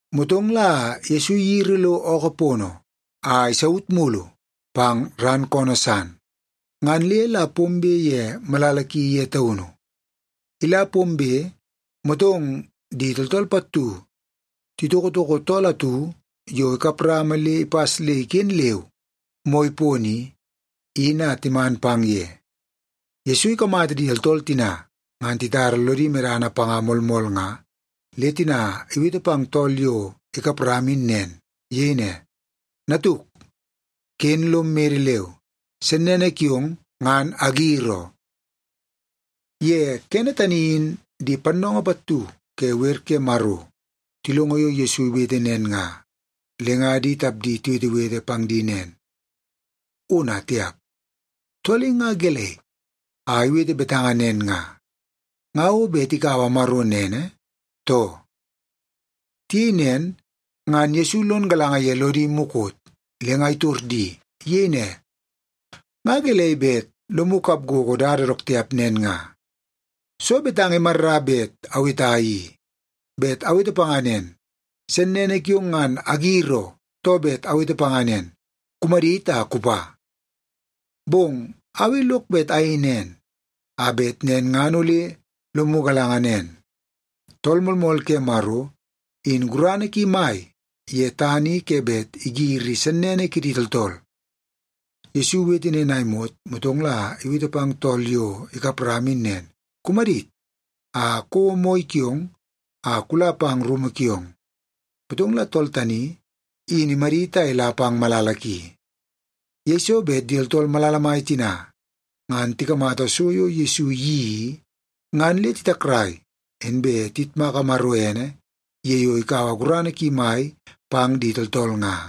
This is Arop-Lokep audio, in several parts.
Motong la Yesu iyiri lo ookoo pono, a isaut mulu pang ran koonoo san. Ngan le la pombe ye malala ki ye taunu. Ila pombe, motong di tooltool pattu titokotoko tool atu yo ikap rama le ipas le iken leu moi pono i, in a timan pang ye. Yesu ikamata di tooltool tina, ngan titara lodi medana panga moolmool nga, le tina iwete pang tool yo ikap rama in nen. Iyei ne, “Natuk, ken lom mede leu. Sennene kiong, ngan agir oo.” Ye kene tani in di pannoongoo pattu ke wer ke Maro tilongo yo Yesu iwete nen nga, le nga di tapdi tiwetewete pang di nen, “Ona, tiap! Tool i nga gelei a iwete betanga nen nga? Nga o bet ikaua Maro nene, too?” Tiyei nen ngan Yesu lon galanga ye lodi mukot, le nga itor di. Iyei ne, “Nga gelei bet lomu kap gogo dada dook tiap nen nga? Soo betanga imarra bet aweta i? Bet awete panga nen, ‘Sennene kiong ngan agir oo,’ too bet awete panga nen, ‘Kumadit a kupa’? Bong au i lok bet ayei nen, a bet nen ngan ole lomu galanga nen, Tool Moolmool ke Maro, in gurana ki mai ye tana i ke bet igiri sennene kidi tooltool.” Yesu iwete nen a imot, motong la iwete pang tool yo ikap rama in nen, “Kumadit, a kouo moi kiong a kula pang rumu kiong.” Motong la tool tani, in imadit a ila pang malala ki. Yeiso bet di tooltool malala mai tina ngan tikamata so yo Yesu iyeii i, ngan le titakrai, inbe tiyitmaka Maro ene ye yo ikaua gurana ki mai pang di tooltool nga.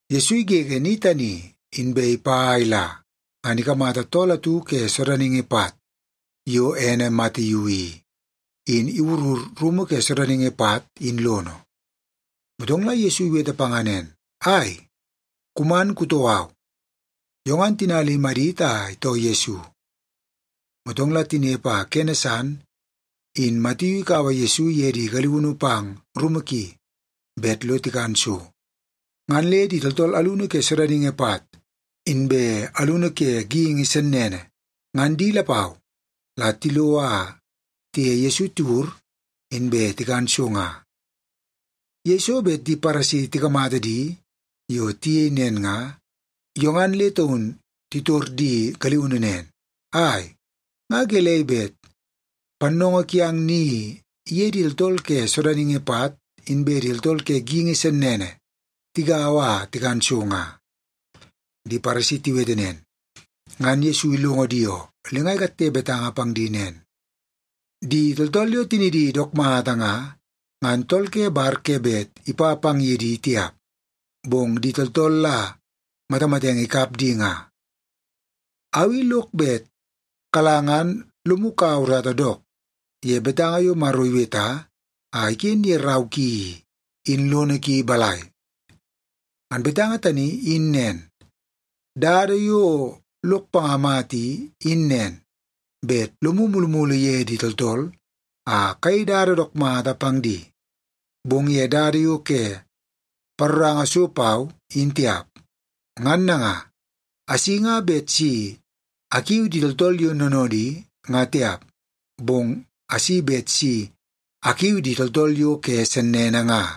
Yesu igege ni tani, inbe ipa a ila, ngan ikamata tool atu ke sodaningi pat yo ene Matiu i, in iwurur rumu ke sodaningi pat in lono. Motong la Yesu iwete panga nen, “Ai, kuman kutoo au.” Yo ngan tina le imadit a itoo Yesu. Motong la tinepe a kene san in Matiu ikaua Yesu iye di galiunu pang rumu ki bet lo tikan so. Ngan le di tooltool alunu ke sodaningi pat, inbe alunu ke geingi sennene, ngan di lapau la tilo a tiye Yesu tiwur, inbe tikan so nga. Yeiso bet di Paresi tikamata di yo tiyei nen nga, yo ngan le taun titor di galiunu nen, “Ai! Nga gelei bet pannoongoo kiang ni iye di tooltool ke sodaningi pat inbe di tooltool ke geingi sennene tigaua a tikan so nga?” Di Paresi tiwete nen, ngan Yesu ilongo di oo. Le nga ikatte betanga pang di nen, “Di tooltool yo tinidi dook mata nga, ngan tool ke bar ke bet ipa pang ye di tiap, bong di tooltool la matamatenge ikap di nga. Au i lok bet kala ngan lomu kaua urata dook ye betanga yo Maro iweta a iken ye rau ki i, in lono ki balai? Ngan betanga tani in nen, ‘Dada yo lok panga mata i, in nen, bet lomu mulumulu ye di tooltool a kayei dada dook mata pang di, bong ye dada yo ke paroranga so pau, in tiap.’ Ngan nanga, asi nga bet si akiu di tooltool yo noonoodi, nga tiap, bong asi bet si akiu di tooltool yo ke sennene nga.”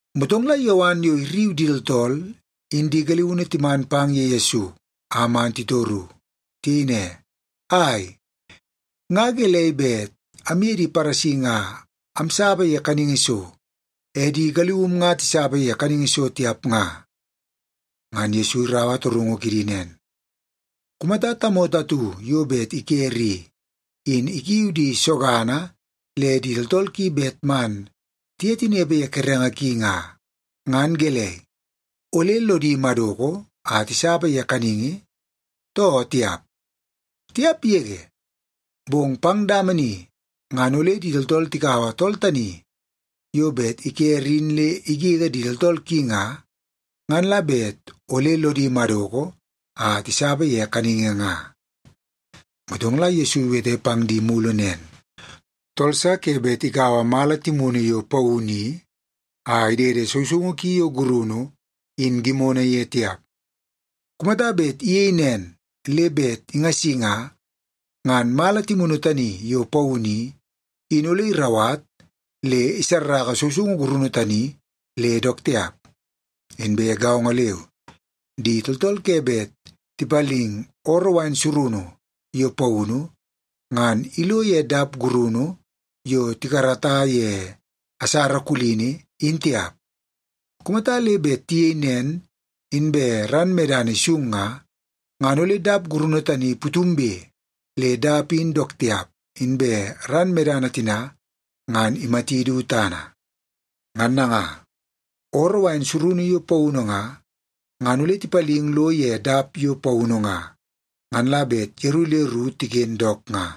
Motong la Yowan yo irriu di tooltool in di galiunu timan pang ye Yesu a man titoru. Tiyei ne, “Ai, nga gelei bet amye di Paresi nga amsapa ye kaningi so, e di galium nga tisapa ye kaningi so tiap nga?” Ngan Yesu iraua torungu kidi nen, “Kumata tamoto atu yo bet ikere i, in ikiu di sogana le di tooltool ki bet man tiye tinepe ye kerenge ki nga, ngan gelei, ole lodi madoko a tisapa ye kaningi, too tiap? Tiap yege! Bong pang dama ni ngan ole di tooltool tikaua tool tani yo bet ikere in le igege di tooltool ki nga, ngan la bet ole lodi madoko a tisapa ye kaningi nga.” Motong la Yesu iwete pang di mulu nen, “Tool sa ke bet ikaua mala timunu yo paunu i a idede sousoungu ki yo gurunu in gimono ye tiap. Kumata bet iyei nen le bet ingasi nga, ngan mala timunu tani yo paunu i, in ole irauwat le isarraka sousoungu gurunu tani le dook tiap. Inbe gaongo leu, di tooltool ke bet tipaling ooroo wain surunu yo paunu, ngan ilo ye dap gurunu yo tikarata ye asara kulini, in tiap. Kumata le bet tiyei nen, inbe ran medana isung nga, ngan ole dap gurunu tani putumbe le dap in dook tiap, inbe ran medana tina ngan imati du tana. Ngan nanga, ooroo wain surunu yo paunu nga, ngan ole tipaling lo ye dap yo paunu nga, ngan la bet yeru le ru tiken dook nga.”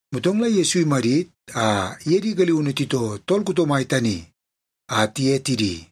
Motong la Yesu imadit a iye di galiunu titoo tool kuto mai tani a tiye tidi.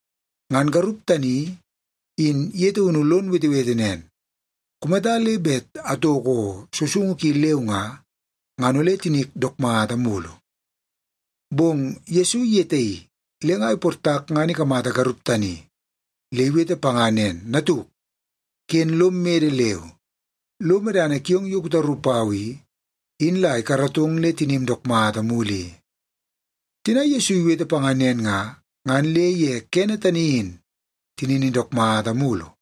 Ngan garup tani, in ye taunu lon wetewete nen, “Kumata le bet atoko sousoungu ki leu nga, ngan ole tinik dook mata mulu.” Bong Yesu iyetaii le nga iportak ngan ikamata garup tani. Le iwete panga nen, “Natuk, ken lom mede leu. Lo medana kiong yo kutaru pau i, in la ikaratong le tinim dook mata mulu i.” Tina Yesu iwete panga nen nga, ngan le ye kene tani in tinini dook mata mulu.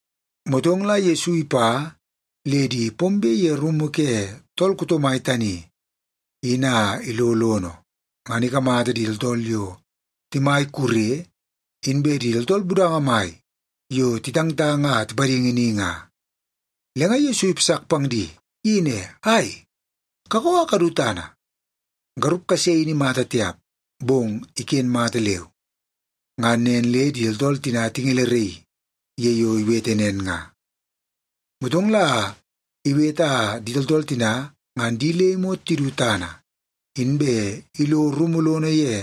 Motong la Yesu ipa le di pombe ye rumu ke tool kuto mai tani in a ilo lono, ngan ikamata di tooltool yo timai kure, inbe di tooltool budanga mai yo titangtang a tipadingi ni nga. Le nga Yesu ipasak pang di. Iyei ne, “Ai, kakoo a kadu tana! Garup kase in imata tiap, bong iken mata leu.” Ngan nen le di tooltool tina tingeleraii ye yo iwete nen nga. Motong la iwete a di tooltool tina ngan di le imot tidu tana, inbe ilo rumu lono ye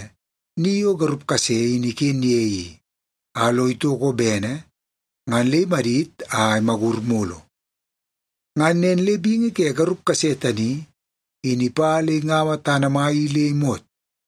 ni yo garup kase in iken ye i, a lo itoko bene, ngan le imadit a imagur mulu. Ngan nen le bingi ke garup kase tani, in ipa le ingaua tana mai i le imot.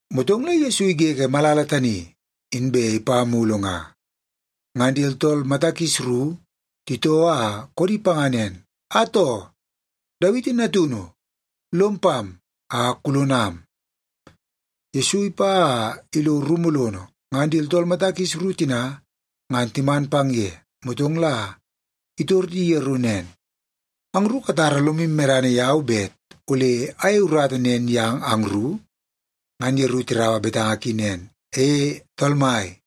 Motong la Yesu igege malala tani, inbe ipa mulu nga. Ngan di tooltool mata kis ru titoo a koodi panga nen, “Atoo, Dawiti natunu! Lom pam a kulonam.” Yesu ipa a ilo rumu lono, ngan di tooltool mata kis ru tina ngan timan pang ye. Motong la itor di yeru nen, “Angru katara lomu medana yau bet ole ayeie urata nen yang angru?” Ngan yeru tiraua betanga ki nen, “E, Tool Mai.”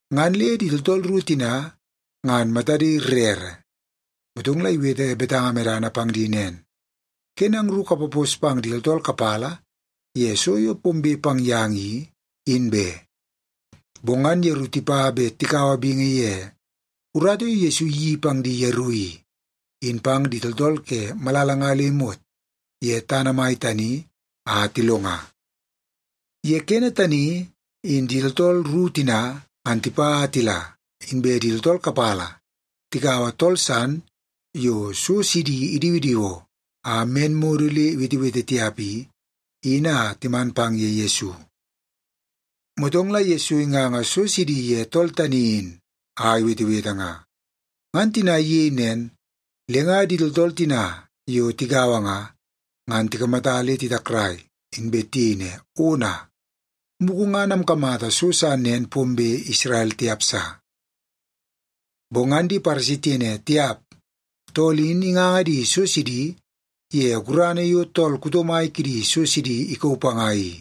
Ngan le di tooltool ru tina ngan matadi rere. Motong la iwete betanga medana pang di nen, “Ken angru kapapos pang di tooltool kapala ye so yo pombe pang yang i, in be.” Bong ngan yeru tipa bet tikaua bingi ye urata yo Yesu iyeii pang di yeru i, in pang di tooltool ke malala nga le imot ye tana mai tani a tilonga. Ye kene tani, in di tooltool ru tina ngan tipa a tila, inbe di tooltool kapala tikaua tool san yo so sidi idiwidiwoo a men modo le iwetewete tiap i, in a timan pang ye Yesu. Motong la Yesu inganga so sidi ye tool tani in a iwetewete nga. Ngan tina iyei nen, le nga di tooltool tina yo tigaua nga, ngan tikamata le titakrai, inbe tiyei ne, “Ona! Mugu ngan amkamata so sa nen pombe Isrel tiap sa.” Bong ngan di Paresi tiyei ne, “Tiap! Tool in inganga di so sidi ye gurana yo tool kuto mai kidi so sidi ikauu panga i.”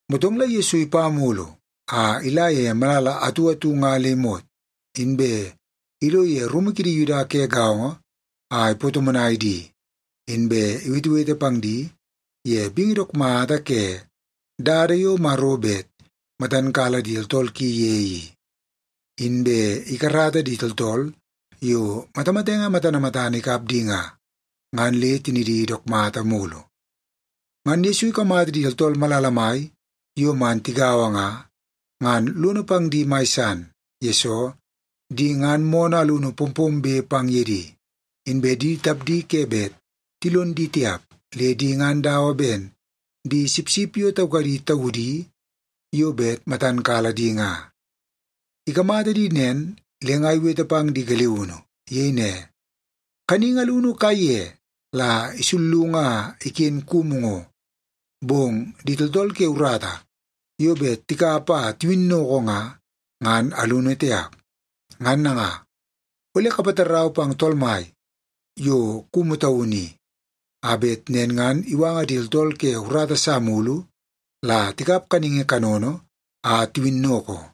Motong la Yesu ipa mulu a ila ye malala atu atu nga le imot, inbe ilo ye rumu kidi Yuda ke gaongo a ipatomonai di, inbe iwetewete pang di ye bingi dook mata ke dada yo Maro bet matan kala di tooltool ki ye i. Inbe ikarata di tooltool yo matamatenge matana matana ikap di nga, ngan le tinidi dook mata mulu. Ngan Yesu ikamata di tooltool malala mai yo man tigaua nga, ngan lono pang di mai san. Yesoo, di ngan moonoo alunu pompombe pang ye di, inbe di tapdi ke bet tilon di tiap, le di ngan dawa ben di sipsip yo taukadi taudi yo bet matan kala di nga. Ikamata di nen, le nga iwete pang di galiunu. Iyei ne, “Kaningi alunu kaiye la isullungu a iken kumu ngo, bong di tooltool ke urata yo bet tikap a tiwinnoko nga, ngan alunu tiap. Ngan nanga, ole kapatarau pang Tool Mai yo kumu taunu i, a bet nen ngan iwanga di tooltool ke urata sa mulu la tikap kaningi kanono a tiwinnoko.”